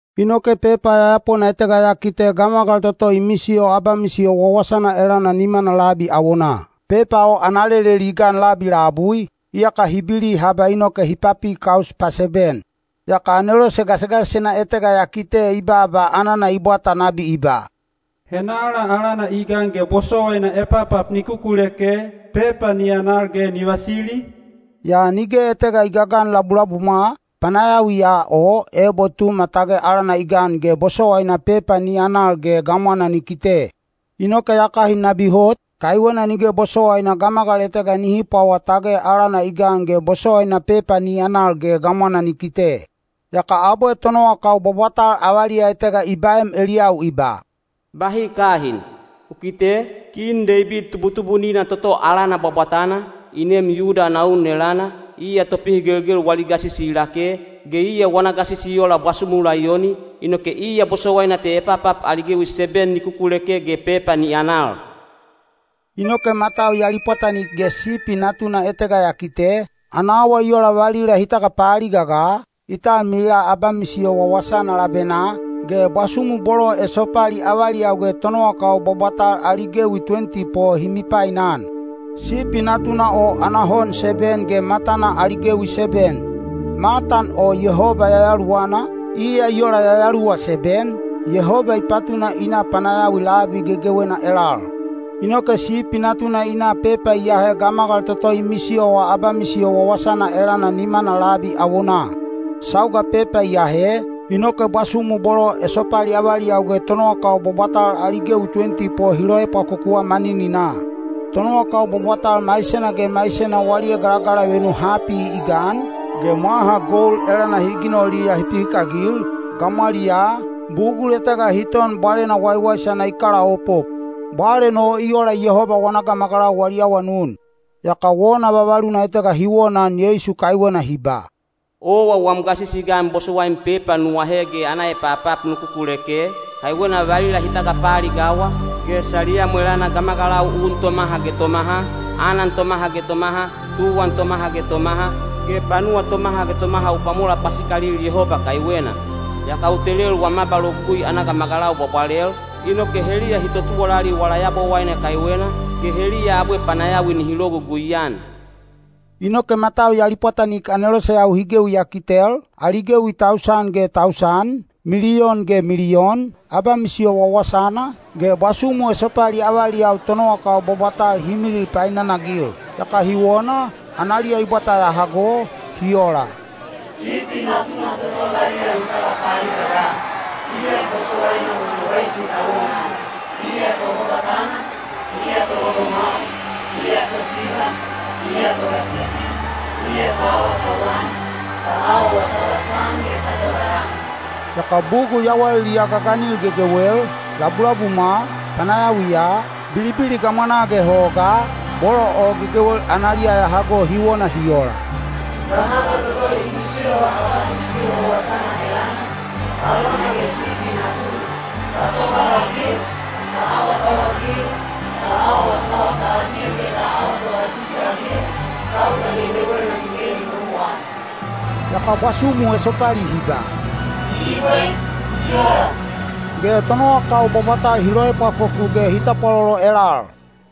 Inoke pepa yayapona etega ya kite gamagal toto i misiyo abamisiyo wawasana elana nimana labi awonaa. Pepa o ana leleli i gan labi labui, iyaka hi bili haba inoke hi papi kaus paseben. Yaka anelose gasigasisena etega ya kite i baaba anana i bwata nabi i ba, “Henala alana i gan ge bosowaina epapap ni kukuleke, pepa ni anal ge ni vasili?” Yaa nige etega i gagan labulabumwa, panayawiya o ebo Tuma tage alana i gan ge bosowaina pepa ni anal ge gamwana ni kite. Inoke ya kahin nabi hot, kaiwena nige bosowaina gamagal etega nihi pwawa tage alana i gan ge bosowaina pepa ni anal ge gamwana ni kite. Yaka abwe tonowakau bwabwatal avaliya etega i baem eliyau i ba, “Bahi kahin! U kite, Kin Deibid tubutubunina toto alana bwabwatana, i neem Yuda ana un elana, iya topihigelgel wali gasisi i lake, ge iya wana gasisi i ola bwasumu laiyoni, inoke iya bosowaina te epapap ali gewi seben ni kukuleke ge pepa ni anal.” Inoke matau ya lipwatanik ge Sipi Natuna etega ya kite, ana awa i ola valila hi tagapaaliga ga, i talmilila abamisiyo wawasana labenaa, ge bwasumu bolo esopali avaliyau ge tonowakau bwabwatal ali gewi tuwenti po hi mipainan. Sipi Natuna o ana hon seben ge matana ali gewi seben. Matan o Yehoba Yayaluwana, iya i ola yayaluwa seben, Yehoba i patuna i na panayawi labi gegewena elal. Inoke Sipi Natuna i na pepa i ahe gamagal toto i misiyowa abamisiyo wawasana elana nimana labi awonaa. Sauga pepa i ahe, inoke bwasumu bolo esopali avaliyau ge tonowakau bwabwatal ali gewi tuwenti po hi loepwakokuwa manininaa. Tonowakau bwabwatal maisena ge maisena wali egalagalavenu hapi i gan, ge mwaha gold elana hi ginoliya hi pihikagil, gamwaliyaa, bugul etega hi ton bwalena waiwaisana i kalaopop. Bwalen o i ola Yehoba wana gamagalau wali awanun. Yaka wona vavaluna etega hi wonaan Yeisu kaiwena hi ba: “Owa wam gasisi i gan bosowaim pepa nu ahe ge ana epapap nu kukuleke, kaiwena valila hi tagapaaligawa, ge saliyam elana gamagalau un tomaha ge tomaha, anan tomaha ge tomaha, tuwan tomaha ge tomaha, ge panuwa tomaha ge tomaha u pwamola pasikalil Yehoba kaiwena. Yaka u telel wam abalogugui ana gamagalau bwabwalel, inoke heliya hi totuwalali wala Yabowaine kaiwena, ge heliya abwe panayawi nihi logugui-an.” Inoke matau ya lipwatanik aneloseyau hi gewi ya kitel, ali gewi tausan ge tausan, miliyon ge miliyon, abamisiyo wawasana, ge bwasumu esopali avaliyau tonowakau bwabwatal hi milil painanagil. Yaka hi wona, analiya i bwata ya hago, hi ola, “Sipi Natuna toto valila hi tagapaaliga ga, iya bosowaina wana waisi ta wonaan, iya Tobwabwatana, iya Togogomwau, iya Tosiba, iya Togasisi, iya ta awatauwan, ta awa wasawasa-an ge ta tobalan.” Yaka bugul yawaliliya gaganil gegewel, labulabumwa, panayawiya, bilibili gamwanaa ge hogaa, bolo o gegewel analiya ya hago hi wona hi ola, “Gamagal toto i misiyowa abamisiyo wawasana elana, alona ge Sipi Natuna, ta tobalagil, ta awatauwagil, ta awa wasawasa-agil ge ta awa togasisi-agil, sauga gegewena nige ni momowasi.” Yaka bwasumu esopali hi ba, “Ibwe. I ola.” Ge tonowakau bwabwatal hi loepwakoku ge hi tapwalolo elal.